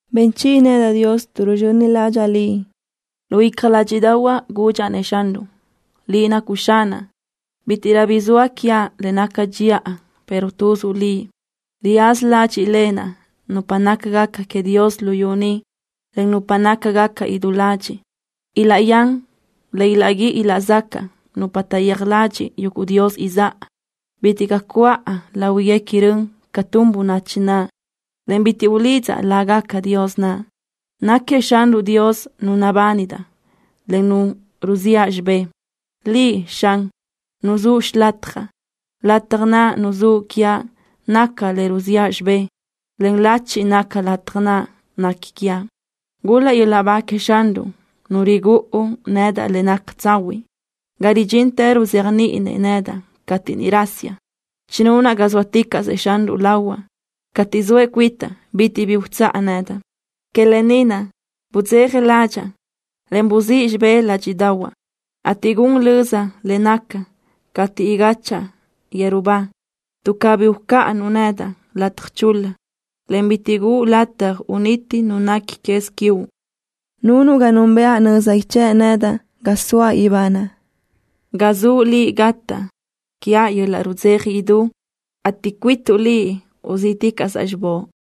Ben chiʼi nedaʼ, Dios, tuʼ ruzxöni ládxaʼa Liʼ. Lu icja ládxiʼdaʼahuaʼ gudxaʼ-nëʼ Xanruʼ: “Liʼ nacuʼ Xanaʼ. Bítiʼrö bi zoa quiaʼ le naca dxiʼa, pero tuzuʼ Liʼ.” Riyaza ládxiʼlenaʼ nupa nácagaca queëʼ Dios luyú ni, en nupa nácagaca idú ladxiʼ. Ilaʼyán le ilaʼguíʼi ilaʼzacaʼ nupa taʼyéaj ladxiʼ yuguʼ dios izáʼa. Bitiʼ caʼ cuʼa láhuiguequi rön ca tun bönachi naʼ, en bitiʼ ulidzaʼ lágaca dios naʼ. Náquiëʼ Xanruʼ Dios Nu nabánidaʼ, en Nu ruziʼa xibé. Liʼ, Xan, nuzúʼ xilatjaʼ. Lataj naʼ nuzúʼ quiaʼ naca le ruziʼa xibé, en lachi naca lataj naʼ nequi quiaʼ. Gul-laʼ yöl-laʼ ba queëʼ Xanruʼ, Nu rigúʼu yöl-laʼ nedaʼ le naca tsahuiʼ, ga ridxintë ruzéajniʼinëʼ nedaʼ cateʼ niʼ rasiaʼ. Chinunaʼ ga zóaticaʼsëʼ Xanruʼ lahuaʼ. Tuʼ zoëʼ cuitaʼ bitiʼ bi utsáʼ nedaʼ. Que lë ni naʼ budzeja ládxaʼa, en buzíʼ xibé ládxiʼdaʼahuaʼ, ateʼ gun löza le nacaʼ cateʼ igáchaʼa yeru ba, tuʼ cabí ucáʼanuʼ nedaʼ lataj chul-la, en bitiʼ guʼu lataj uniti nu nequi quez quiuʼ. Nunuʼ ga núnbëʼa nöza ichë́ʼ nedaʼ ga soaʼ ibanaʼ. Ga zuʼ Liʼ gataʼ quiaʼ yöl-laʼ rudzeja idú, ateʼ cuituʼ Liʼ uzíʼticaʼsaʼ xibóʼ.